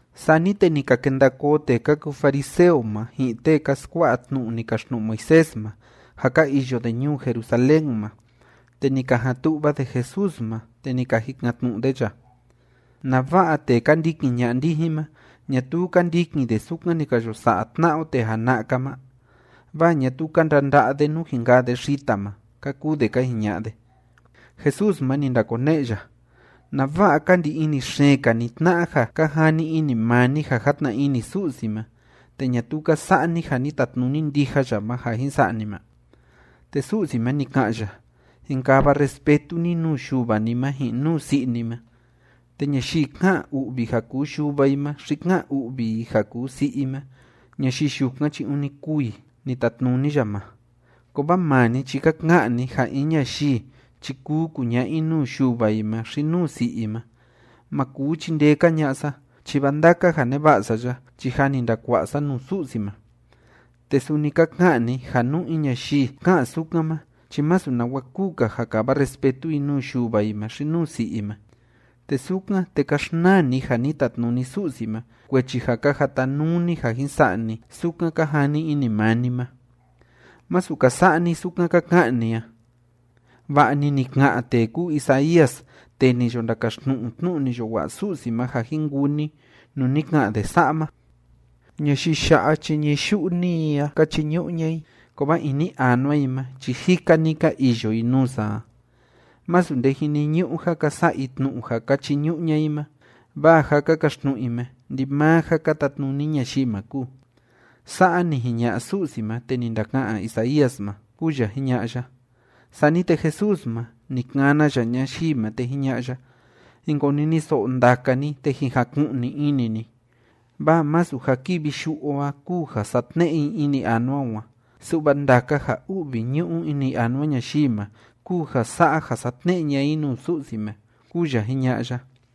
Sani te ni ka kenda koo tee ka kuu fariseo ma, ji'in tee ka skua'a tnu'u ni kaxtnu'u Moisés ma, ja ka iyo de ñuu Jerusalén ma. Te ni ka jan tu'va de Jesús ma, te ni ka jikan‑tnu'u de ya: ―¿Nava'a tee ka ndikin ña'a ndijin ma, ñatuu ka ndikin de sukan ni ka yo sa'a tna'a o tee jana'a‑ka ma? Vaa ñatuu ka ndanda'a de nú jin kaa de xita ma ―ka kuu de ka jiña'a de. Jesús ma, ni ndakone'e ya: ―¿Nava'a ka ndi ini xeen‑ka ni tna'a ja ka jani ini maa ni ja játna ini Su'si ma, te ñatuu ka sa'a ni ja ni tatnuni ndija ya ma ja jin sa'a ni ma? Te Su'si ma, ni ka'an ya: “Jin kava respetu ni nuu yuva ni ma ji'in nuu si'i ni ma”, te “Ñayii ká'an u'vi i ja kuu yuva i ma xi ká'an u'vi i ja kuu si'i i ma, ñayii yukan chi ûni kûu i”, ni tatnuni ya ma. Kovaa maa ni chi ka ka'an ni ja in ñayii chi kuu kuña'a i nuu yuva i ma xi nuu si'i i ma: “Ma kuu chindee‑ka ña'a sa, chi vaa ndaka ja neva'a sa ya chi jâ ni ndakua'a sa nuu Su'si ma.” Te suni ka ka'an ni ja nú in ñayii ká'an sukan ma chi masu nawa kuu‑ka ja kava respetu i nuu yuva i ma xi nuu si'i i ma. Te sukan, te ka xnaa ni ja ni tatnuni Su'si ma, kuechi ja ka jatanuu ni ja jin sa'a ni sukan ka jani ini maa ni ma. ’¡Masu ka sa'a ni sukan ka ka'an ni a! Va'a‑ni ni ka'an tee kúu Isaías tee ni yo ndakaxtnu'u tnu'u ni yo wa'a Su'si ma ja jin kuu ni nuu ni ka'an de sa'a ma: Ñayii ya'a chi ñií yu'u‑ni i a ka chiñu'u ña'a i, kovaa ini anua i ma chi jika‑ni ka iyo i nuu sa a. Masu nde jiniñu'u ja ka sa'a i tnu'u ja ka chiñu'u ña'a i ma, vaa ja ka kaxtnu'u i ma, ndimaa ja ka tatnuni ñayii ma kúu. Sa'a ni jiña'a Su'si ma te ni ndaka'an Isaías ma, ―kúu ya jiña'a ya. Sani te Jesús ma, ni kana ya ñayii ma, te jiña'a ya: ―Jin koniniso'o ndaka ni, te jin jaku'ni ini ni. Vaa masu ja kivi yu'u o a kúu ja satne'e i ini anua o a, su'va ndaka ja u'vi ñu'u ini anua ñayii ma kúu ja sa'a ja satne'e ña'a i nuu Su'si ma ―kúu ya jiña'a ya.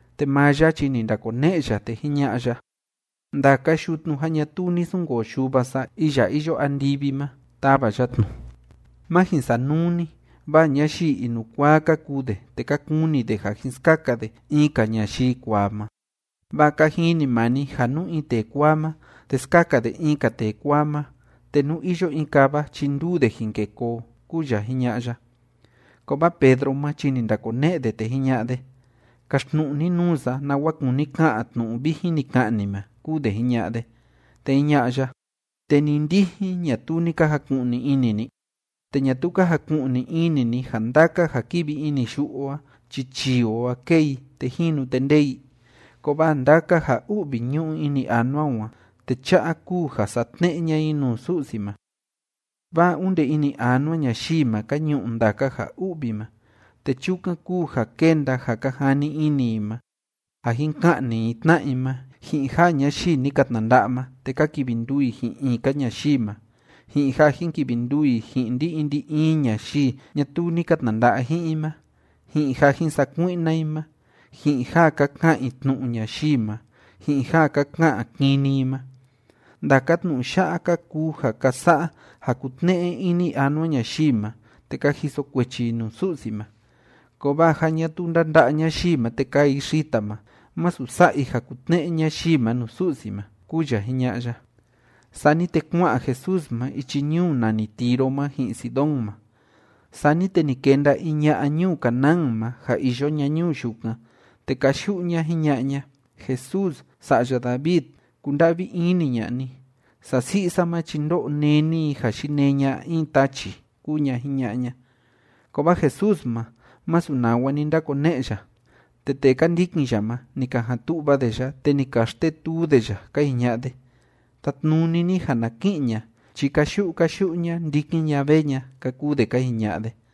Te maa ya chi ni ndakone'e ya, te jiña'a ya: ―Ndaka yutnu ja ñatuu ni sunkoo Yuva sa iya iyo andivi ma, tava ya tnu. Má jin sanuu ni, vaa ñayii inukuaa ka kuu de, te ka kuni de ja jin skaka de in‑ka ñayii kuaa ma. Vaa ka jini maa ni ja nú in tee kuaa ma, te skaka de in‑ka tee kuaa ma, te nú iyo in kava chi nduu de jin kê koo ―kúu ya jiña'a ya. Kovaa Pedro ma chi ni ndakone'e de, te jiña'a de: ―Kaxtnu'u ni nuu sa nawa kúni ka'an tnu'u vijin ni ka'an ni ma ―kúu de jiña'a de. Te jiña'a ya: ―¿Te ni ndijin, ñatuu ni ka jaku'ni ini ni? ¿Te ñatuu ka jaku'ni ini ni ja ndaka ja kívi ini yu'u o a chi chii o a kée i, te jínu, te ndée i? Kovaa ndaka ja u'vi ñu'u ini anua o a, te cha'a kúu ja satne'e ña'a i nuu Su'si ma. Vaa onde ini anua ñayii ma ka ñu'u ndaka ja u'vi ma, te chukan kúu ja kénda ja ka jani ini i ma, ja jin ka'ni i tna'a i ma, ji'in ja ñayii ni ka tnanda'a ma, te ka kivi nduu i ji'in in‑ka ñayii ma, ji'in ja jin kivi nduu i ji'in ndi‑in ndi‑in ñayii ñatuu ni ka tnanda'a ji'in i ma, ji'in ja jin sakui'na i ma, ji'in ja ka ka'an i tnu'u ñayii ma, ji'in ja ka ka'an kini i ma. Ndaka tnu'u ya'a ka kuu ja ka sa'a ja kútne'e ini anua ñayii ma te ka jiso kuechi i nuu Su'si ma. Kovaa ja ñatuu ndánda'a ñayii ma te kaa i xita ma, masu sa'a i ja kútne'e ñayii ma nuu Su'si ma ―kúu ya jiña'a ya. Sani te kua'an Jesús ma ichi ñuu nani Tiro ma ji'in Sidón ma. Sani te ni kenda in ña'a ñuu Canaán ma ja iyo ña ñuu yukan, te káyu'u ña jiña'a ña: ―Jesús, Sa'ya David, kunda'vi ini ña'a ni. Sasi'i sa ma chi ndó'o néni i ja yinee ña'a in tachi ―kúu ña jiña'a ña. Kovaa Jesús ma, masu nawa ni ndakone'e ya. Te tee ka ndikin ya ma, ni ka jan tu'va de ya, te ni ka xtetuu de ya ka jiña'a de: ―Tatnuni ni ja na ki'in ña chi káyu'u káyu'u ña ndikin ña vee ña ―ka kuu de ka jiña'a de.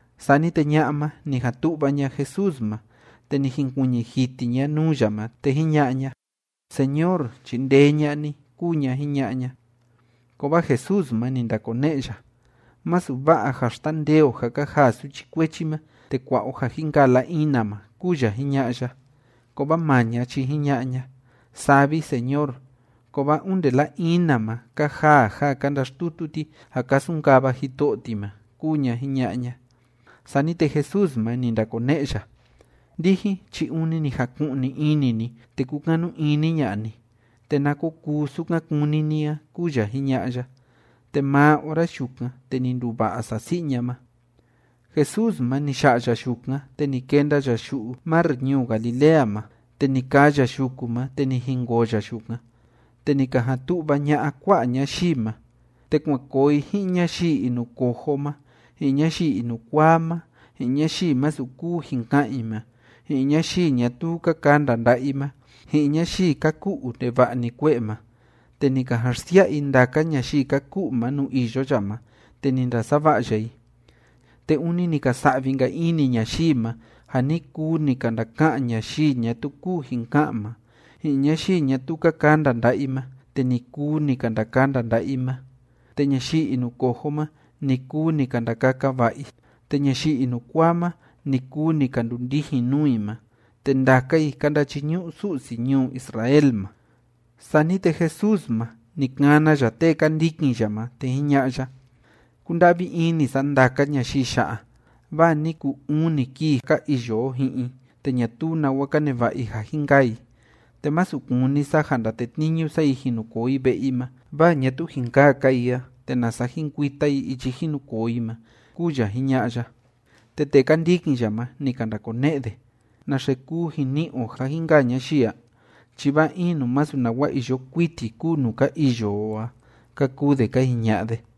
Sani te ña'a ma, ni jan tu'va ña Jesús ma, te ni jinkuiñi jiti ña nuu ya ma, te jiña'a ña: ―Señor, chindee ña'a ni ―kúu ña jiña'a ña. Kovaa Jesús ma, ni ndakone'e ya: ―Masu va'a ja xtandee o ja ka jaa suchi kuechi ma te kua'a o ja jin kaa la‑ina ma ―kúu ya jiña'a ya. Kovaa maa ña chi jiña'a ña: ―Saa vi, Señor, kovaa onde la‑ina ma ka jaa ja ka ndaxtutu ti ja ka sunkava jito'o ti ma ―kúu ña jiña'a ña. Sani te Jesús ma, ni ndakone'e ya: ―Ndijin chi ûni ni jaku'ni ini ni te kúkanu ini ña'a ni. Te na ko kuu sukan kúni ni a ―kúu ya jiña'a ya. Te maa ora yukan, te ni nduva'a sasi'i ña ma. Jesús ma, ni ya'a ya yukan, te ni kenda ya yu'u mar ñuu Galilea ma, te ni kaa ya yuku ma, te ni jinkoo ya yukan. Te ni ka jan tu'va ña'a kua'a ñayii ma, te kuan koo i ji'in ñayii inucojo ma, ji'in ñayii inukuaa ma, ji'in ñayii masu kuu jin ka'an i ma, ji'in ñayii ñatuu ka kanda nda'a i ma, ji'in ñayii ka ku'u ndeva'a‑ni kue'e ma, te ni ka jan xsia'a i ndaka ñayii ka ku'u ma nuu iyo ya ma, te ni ndasava'a ya i. Te ûni ni ka sa'vi‑nka ini ñayii ma ja ni kuu ni ka ndaka'an ñayii ñatuu kuu jin ka'an ma, ji'in ñayii ñatuu ka kanda nda'a i ma, te ni kuu ni ka ndakanda nda'a i ma, te ñayii inucojo ma, ni kuu ni ka ndakaka va'a i, te ñayii inukuaa ma, ni kuu ni ka ndundijin nuu i ma, te ndaka i ka ndachiñu'u Su'si ñuu Israel ma. Sani te Jesús ma, ni kana ya tee ka ndikin ya ma, te jiña'a ya: ―Kúnda'vi ini sa ndaka ñayii ya'a, vaa ni kuu uni kii ka iyo o ji'in i, te ñatuu nawa ka neva'a i ja jin kaa i. Te masu kúni sa ja ndatetniñu sa i jin nu koo i ve'e i ma, vaa ñatuu jin kaa‑ka i a, te nasa jin kuita i ichi jin nu koo i ma ―kúu ya jiña'a ya. Te tee ka ndikin ya ma, ni ka ndakone'e de: ―¿Naxe kuu jin ni'i o ja jin kaa ñayii a? Chi vaa in nuu masu nawa iyo kuiti kúu nuu ka iyo o a ―ka kuu de ka jiña'a de.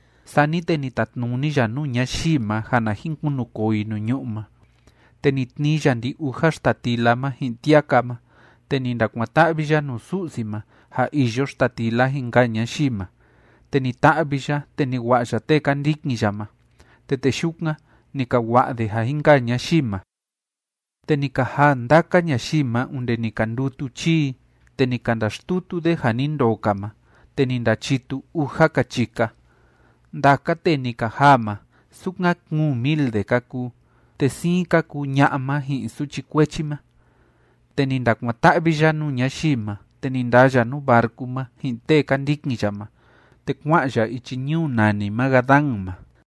Sani te ni tatnuni ya nuu ñayii ma ja na jin kunukoo i nuu ñu'ú ma. Te ni tnii ya ndi‑uja xtatila ma ji'in tiaka ma, te ni ndakuan‑ta'vi ya nuu Su'si ma ja iyo xtatila jin kaa ñayii ma. Te ni ta'vi ya, te ni wa'a ya tee ka ndikin ya ma. Te tee yukan, ni ka wa'a de ja jin kaa ñayii ma. Te ni ka jaa ndaka ñayii ma onde ni ka ndutu chii i. Te ni ka ndaxtutu de ja ni ndoo‑ka ma, te ni ndachitu uja‑ka chika. Ndaka tee ni ka jaa ma, sukan kuun mil de ka kuu, te siin ka kuu ña'a ma ji'in suchi kuechi ma. Te ni ndakuan‑ta'vi ya nuu ñayii ma, te ni ndaa ya nuu barcu ma ji'in tee ka ndikin ya ma, te kua'an ya ichi ñuu nani Magadán ma.